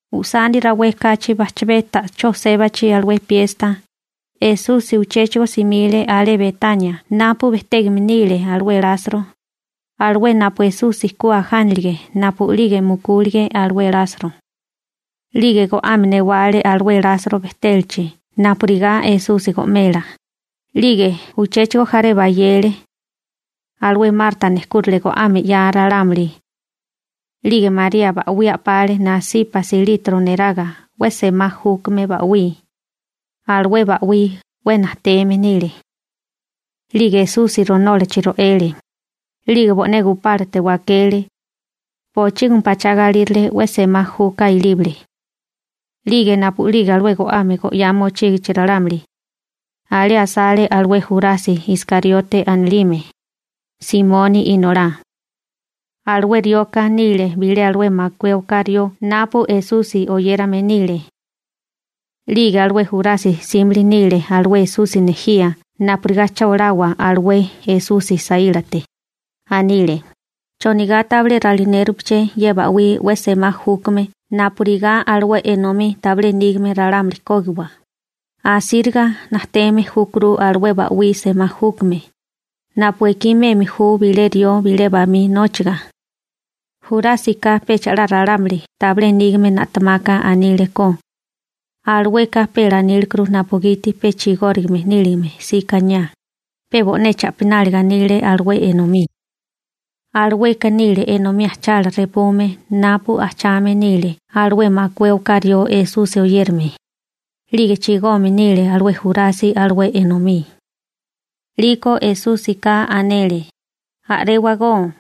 Ujsani rawé kachi bajchabé ta'chó sébachi alué piesta, Esusi uchéchigo simile alé Betania napu bejtégame nile alué Lasro, alué napu Esusi ku ajánalige napu'lige mukúlige alué Lasro. 'Lige go'ame newale alé Lasro bejtélachi napurigá Esusi go'mela, 'lige uchéchigo jaré bayele. Alué Marta nejkúrale go'ame 'yaa ralámuli. 'Lige María ba'wí a'pale nasípasi litro neraga 'we semá júkame ba'wí. Alué ba'wí 'we najteme nile. 'Lige Esusi ronólachi ro'ele, 'lige bo'né gupálate wakele. Bochígimi pachá galírale 'we semá juka ilíbale. 'Lige napu'lige alué go'ame go'yá mochígichi ralámuli, alé asale alué Jurasi Iskariote anilime, Simoni inolá. Alué rioka bilé nile alué makué oká rió napu Esusi oyérame nile. 'Lige alué Jurasi 'símili nile alué Esusi nejía napurigá cha olawa alué Esusi saílate. Anile: ―¿Chonigá tabilé ralinérupeché ye ba'wí 'we semá júkame napurigá alué enomí tabilé nígame ralámuli kógiwa? Asíriga najteme júkuru alué ba'wí semá júkame, napu ekí meme ju bilé rió bilé bamí nóchiga. Jurásika pecha 'la ralámuli tabilé nígame na'temaka aníleko, alueka pe lanílekuru napugiti pe chigórigame níligame 'sika aniá, pe bo'né cha'pináliga anile alué enomí. Alueka nile enomí ajchala repume napu ajchame nile alué makué oká rió Esusi oyérame, 'lige chigome nile alué Jurasi alué enomí. 'Liko Esúsika anele: ―A'réwagó.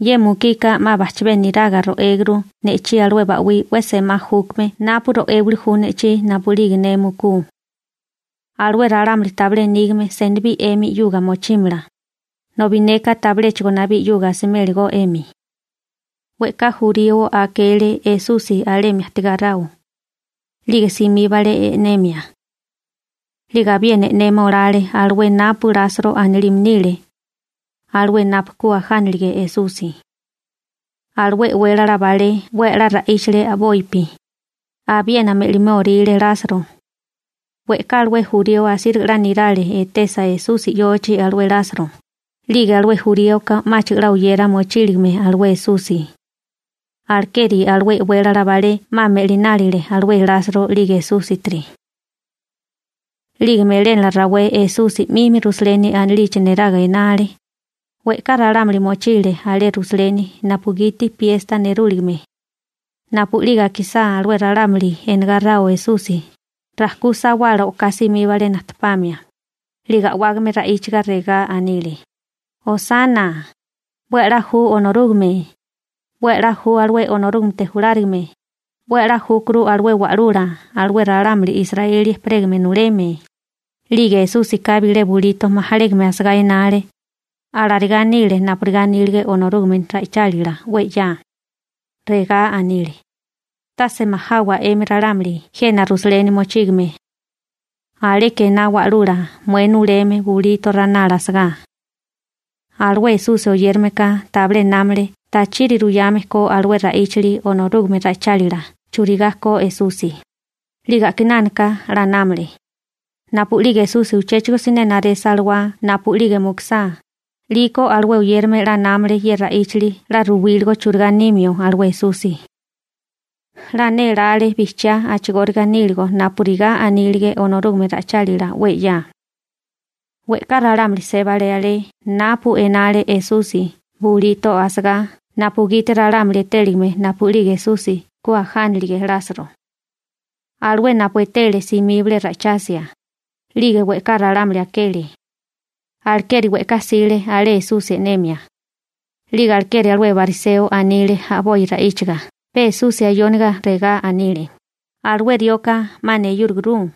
Ye mukika 'ma bajchabé niraga ro'éguru ne'chí alué ba'wí 'we semá júkame napu ro'émili ju ne'chí napu'lige ne mukú. Alué ralámuli tabilé nígame senibí 'emi 'yuga mochímala, nobi neka tabiléchigo nabí 'yuga asiméligó 'emi. We'ká jurío akele Esusi alemi ajtigáráo, 'lige simíbale e'nemia. 'Lige abiena e'nema olale alué napu Lasro anilime nile, alué napu ku ajánilige Esusi. Alué e'wélala balé 'we a'lá ra'íchale a'bopi, abiena me'liméoríle Lasro. We'ká alué jurío asíriga 'la nirale etesa Esusi 'yochi alué Lasro, 'lige alué juríoka 'máchigo 'la oyera mochíligame alué Esusi. Alekeri alué e'wélala balé 'ma me'linálile alué Lasro 'lige Esúsitiri. 'Lige melénala rawé Esusi 'mimi Rusaleni anilichi neraga enale. We'ká ralámuli mochile alé Rusaleni napugiti piesta nerúligime. Napu'lige akisá alué ralámuli enegáráo Esusi, rajkú sawala o'ká simíbale najtepamia, 'lige a'wágame ra'íchaga regá anile: ―¡Hosana (salva)! ¡'We a'lá ju Onorúgame! ¡'We a'lá ju alué Onorúgamete julárigame! ¡'We a'lá júkuru alué Wa'lula alué ralámuli Israeli ejperégame nuleme! 'Lige Esúsika bilé bulito majalégame asagá enale. Alarigá nile napurigá anílige Onorúgame ra'ichálila 'we 'ya. Regá anile: Tase majawa 'emi ralámuli jena Rusaleni mochígame. Aleka ená wa'lula mué nuleme bulito ranala asagá. Alué Esusi oyérameka tabilé námale tachiri ruyame ko alué ra'íchali Onorúgame ra'ichálila churigá ko Esusi, 'lige a'kinánaka 'la námale. Napu'lige Esusi uchéchigo siné naresa alawá napu'lige mukusá, 'liko alué oyérame 'la námale ye ra'íchali 'la ruwíligo churigá 'simio alué Esusi. 'La nélále bijchiá a'chigóriga níligo napurigá anílige Onorúgame ra'ichálila 'we 'ya. We'ká ralámuli sébale alé napu enale Esusi bulito asagá napugiti ralámuli etéligame napu'lige Esusi ku ajánilige Lasro. Alué napu etele simíbale ra'ichasia, 'lige we'ká ralámuli akele. Alekeri we'ká jsile alé Esusi e'nemia. 'Lige alekeri alué bariseo anile a'boi ra'íchiga pe Esusi ayóniga, regá anile: ―¡Alué rioka 'ma neyúraguru!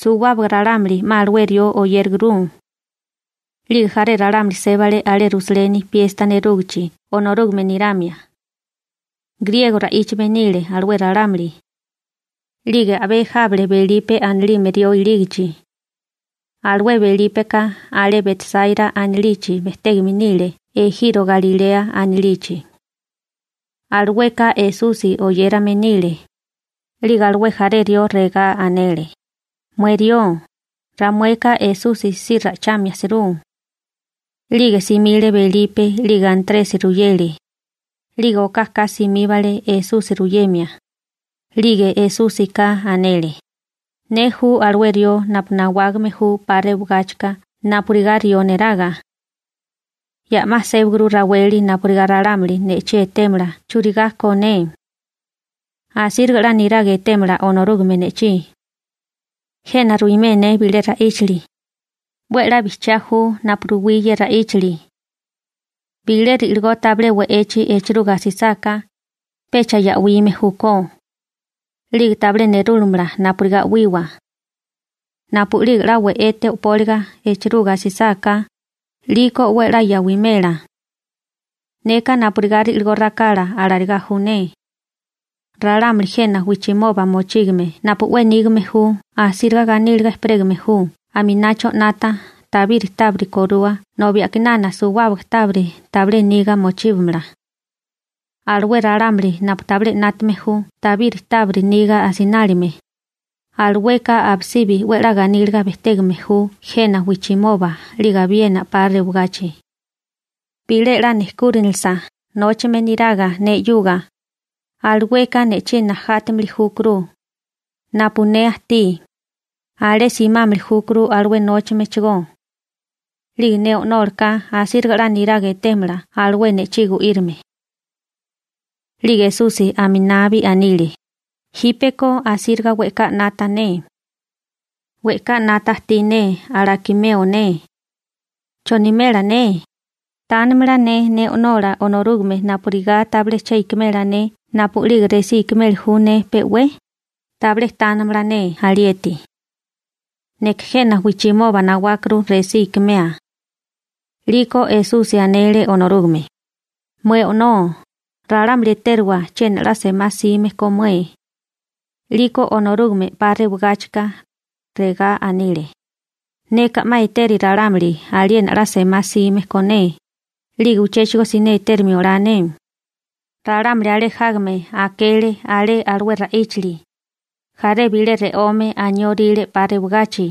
¡Suwábaga ralámuli 'ma alué rió oyéraguru! 'Lige jaré ralámuli sébale alé Rusaleni piesta nerúgichi Onorúgame niramia. Griego ra'íchame nile alué ralámuli. 'Lige a'bé jábale Belipe anilime rió ilígichi. Alué Belípeka alé Betsáira anilichi bejtégame nile ejiro Galilea anilichi. Alueka Esusi oyérame nile. 'Lige alué jaré rió regá anele: ―Mué rió, ramueka Esusi si ra'ichamia jsirú. 'Lige simile Belipe 'lige Antresi ruyele, 'lige okaka simíbale Esusi ruyemia. 'Lige Esúsika anele: ―Ne ju alué rió napu nawágame ju 'pa rewagáchika napurigá rió neraga. Ya 'ma sébaguru raweli napurigá ralámuli ne'chí etémala churigá ko ne. Asíriga 'la niraga etémala Onorúgame ne'chí. Jena ruimé ne bilé ra'íchali. 'We a'lá bijchiá ju napu ruwí ye ra'íchali. Bilé ri'ligó tabilé we'echi echiruga asisáká, pecha ya'wime júkó. 'Lige tabilé nerúlamala napurigá 'wiwa. Napu'lige 'la we'ete o'póliga echiruga asisáká, 'liko 'we a'lá ya'wimela. Neka napurigá ri'ligó rakala alarigá ju ne. Ralámuli jena wijchimoba mochígame napu 'we nígame ju asíriga ganíliga ejperégame ju aminacho 'nata tabiri tábiri korua nobi a'kinana suwábaga tábiri tabilé niga mochíbamala. Alué ralámuli napu tabilé 'nátame ju tabiri tábiri niga asinálime, alueka abisibi 'we a'lá ganíliga bejtégame ju jena wijchimoba 'lige abiena 'pa rewagachi. Bilé 'la nejkúrinilisa nóchame niraga ne 'yuga, alueka ne'chí najátimili júkuru. Napu ne ajtí, alé simámili júkuru alué nóchamechigó. 'Lige ne O'nólaka asíriga 'la niraga etémala alué ne'chí gu'írime. 'Lige Esusi aminabi anile: ―Jípeko asíriga we'ká 'nata ne. We'ká 'nata ajtí ne alakimeo ne. ¿Chonimela ne? ¿Tánamala ne O'nola Onorúgame napurigá tabilé che ikimela ne napu'lige resí ikimeli ju ne pe 'we? Tabilé tánamala ne alieti. Neka jena wijchimoba nawákuru resí ikimea. 'Liko Esusi anele Onorúgame: ―Mué O'nó, ralámuli etériwa chiena 'la semá 'sime ko mué. 'Liko Onorúgame 'pa rewigáchika, regá anile: ―Neka 'ma eteri ralámuli aliena 'la semá 'sime ko ne, 'lige uchéchigo siné etérimio olá ne. Ralámuli alé jágame akele alé alué ra'íchali. Jaré bilé re'ome anióríle 'pa rewagachi.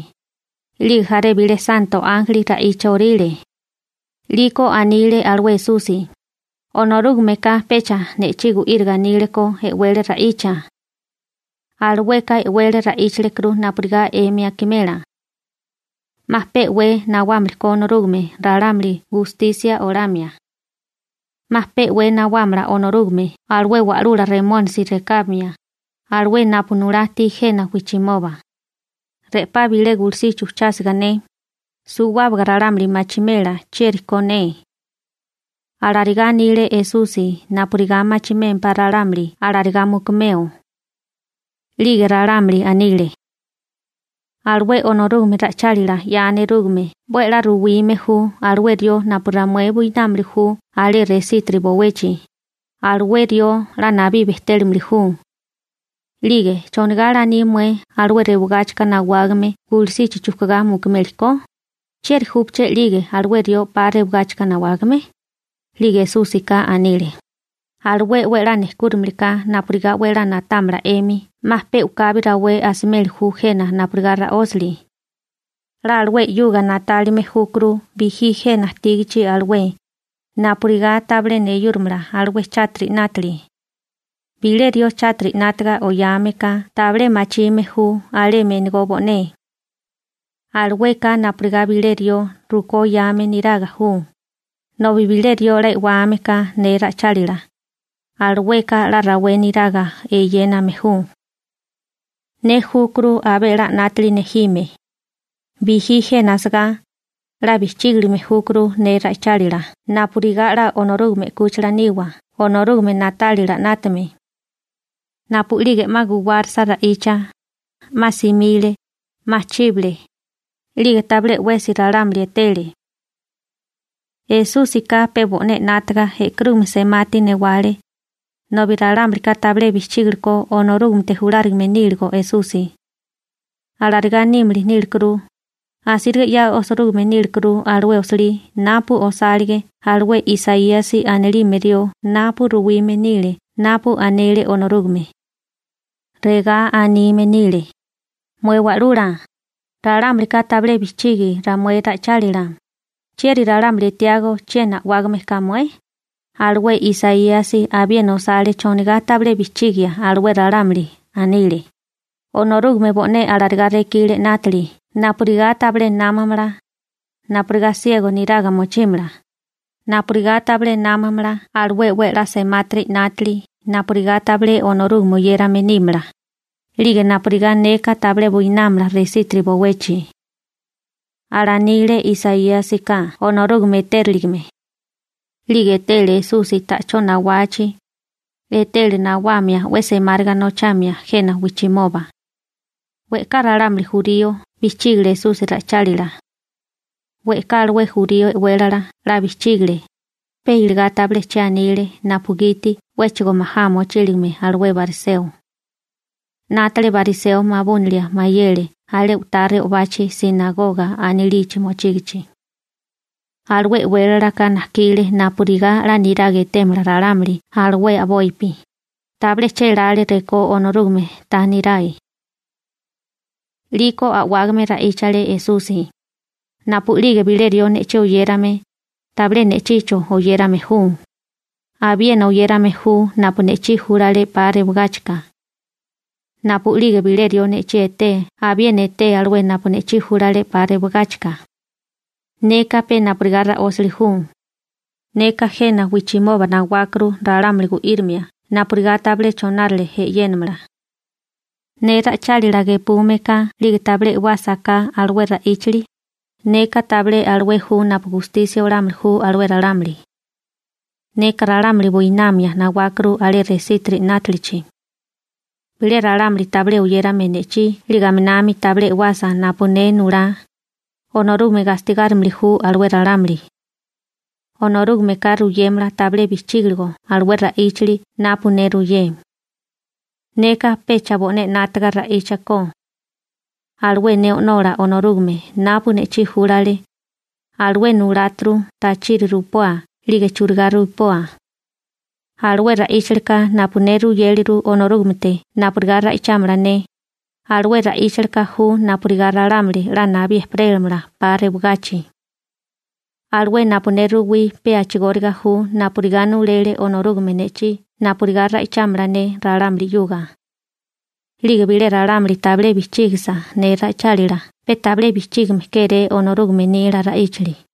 'Lige jaré bilé santo ánjeli ra'icha orile. 'Liko anile alué Esusi: ―Onorúgameka pecha ne'chí gu'íriga anile ko e'wele ra'icha. Alueka e'wele ra'íchalekuru napurigá 'emi akimela. 'Ma pe'wé nawámili ko Onorúgame gustisia olámia. 'Ma pe'wé nawámala Onorúgame alué wa'lula Remónisi rekábamia, alué napu nulá ajtí jena wijchimoba. Re'pá bilé gulusichi ujchásiga ne, suwábaga ralámuli machimela chieri ko ne. Alarigá anile Esusi napurigá machimémpá ralámuli alarigá mukumeo. 'Lige ralámuli anile: ―Alué Onorúgame ra'ichálila 'ya nerúgame 'we a'lá ruwime ju alué rió napu ramué buinámili ju alé resítiri bowechi, alué rió 'la nabí bejtélimili ju. 'Lige ¿chonigá laní mué alué rewigáchika nawágame gulusichi chujkugá mukumeli ko? ¿Chieri júpaché 'lige alué rió 'pa rewigáchika nawágame? 'Lige Esúsika anile: ―Alué 'we a'lá nejkúramiliká napurigá 'we a'lá na'támala 'emi 'ma pe u'kabi rawé asimeli ju jena napurigá ra'ósali. 'La alué 'yuga na'tálime júkuru bijí jena ajtígachi alué, napurigá tabilé neyúramala alué chátiri 'nátili. Bilé rió chátiri 'nátiga oyame ka tabilé machime ju alemi enegó bo'né. Alueka napurigá bilé rió rukó oyame neraga ju, nobi bilé rió 'la e'wame ka ne ra'ichálila, alueka 'la rawé neraga eyéname ju. Ne júkuru abé 'la 'nátili nejime. Bijí jena asagá, 'la bijchígilime júkuru ne ra'ichálila napurigá 'la Onorúgame 'kúchila niwa Onorúgame na'tálila 'nátame. Napu'lige 'ma guwárisa ra'icha, 'ma simile, 'ma chíbale, 'lige tabilé 'wesi ralámuli etele. Esúsika pe bo'né 'nátaga e'karúgame semati newale, nobi ralámulika tabilé bijchígili ko Onorúgamete julárigame níligo Esusi. Alarigá nímili nílekuru, asíriga 'ya osirúgime nílekuru alué osilí napu osálige alué Isaíasi anilime rió napu ruwime nile napu anele Onorúgame. Regá anime nile: Mué Wa'lula, ralámulika tabilé bijchigi ramué ra'ichálila. ¿Chieri ralámuli etiágó chiena a'wágame ka mué? Alué Isaíasi abiena osale chonigá tabilé bijchígia alué ralámuli. Anile: Onorúgame bo'né alarigá rekile 'nátili napurigá tabilé námamala, napurigá siego niraga mochímala, napurigá tabilé námamala alué 'we a'lá semátiri 'nátili napurigá tabilé Onorúgame oyérame nímala, 'lige napurigá neka tabilé buinámala resítiri bowechi. Alanile Isaíasika Onorúgame etériligime. 'Lige etele Esusi ta'chó nawachi, etele nawamia 'we semáriga nochamia jena wijchimoba. We'ká ralámuli jurío bijchígale Esusi ra'ichálila. We'ká alué jurío e'wélala 'la bijchígale, pe iligá tabilé che anile napugiti 'wéchigo majá mochíligame alué bariseo. 'Nátale bariseo mabúnilia mayele alé u'tá re'obachi «sinagoga» anilichi mochígichi. Alué e'wélalaka najkile napurigá 'la niraga etémala ralámuli alué a'bopi, tabilé chélále rekó Onorúgame ta nirae. 'Liko a'wágame ra'íchale Esusi: ―Napu'lige bilé rió ne'chí oyérame, tabilé ne'chicho oyérame ju, abiena oyérame ju napu ne'chí júlale 'pa rewagáchika. Napu'lige bilé rió ne'chí etee abiena eté alué napu ne'chí júlale 'pa rewigáchika. Neka pe napurigá ra'ósali ju. Neka jena wijchimoba nawákuru ralámuli gu'írimia napurigá tabilé chonárale e'yénamala. Ne ra'ichálila gepume ka 'lige tabilé e'wásaká alué ra'íchali, neka tabilé alué ju napu gustisia olámili ju alué ralámuli. Neka ralámuli buinamia nawákuru alé resítiri 'nátalichi. Bilé ralámuli tabilé oyérame ne'chí 'lige aminami tabilé e'wasa napu ne nulá, Onorúgame gastigárimili ju alué ralámuli. Onorúgameka ruyémala tabilé bijchígiligo alué ra'íchali napu ne ruyé. Neka pecha bo'né 'nátaga ra'íchakó. Alué ne O'nola Onorúgame napu ne'chí júlale, alué nuláturu tachiri rupoa 'lige churigá rupoa. Alué ra'íchalika napu ne ruyéleru Onorúgamete napurigá ra'ichámala ne, alué ra'íchalika ju napurigá ralámuli 'la nabí ejperélamala 'pa rewagachi. Alué napu ne ruwí pe a'chigóriga ju napurigá nulele Onorúgame ne'chí napurigá ra'ichámala ne ralámuli 'yuga. 'Lige bilé ralámuli tabilé bijchígisa ne ra'ichálila pe tabilé bijchígime kéré Onorúgame nila ra'íchali.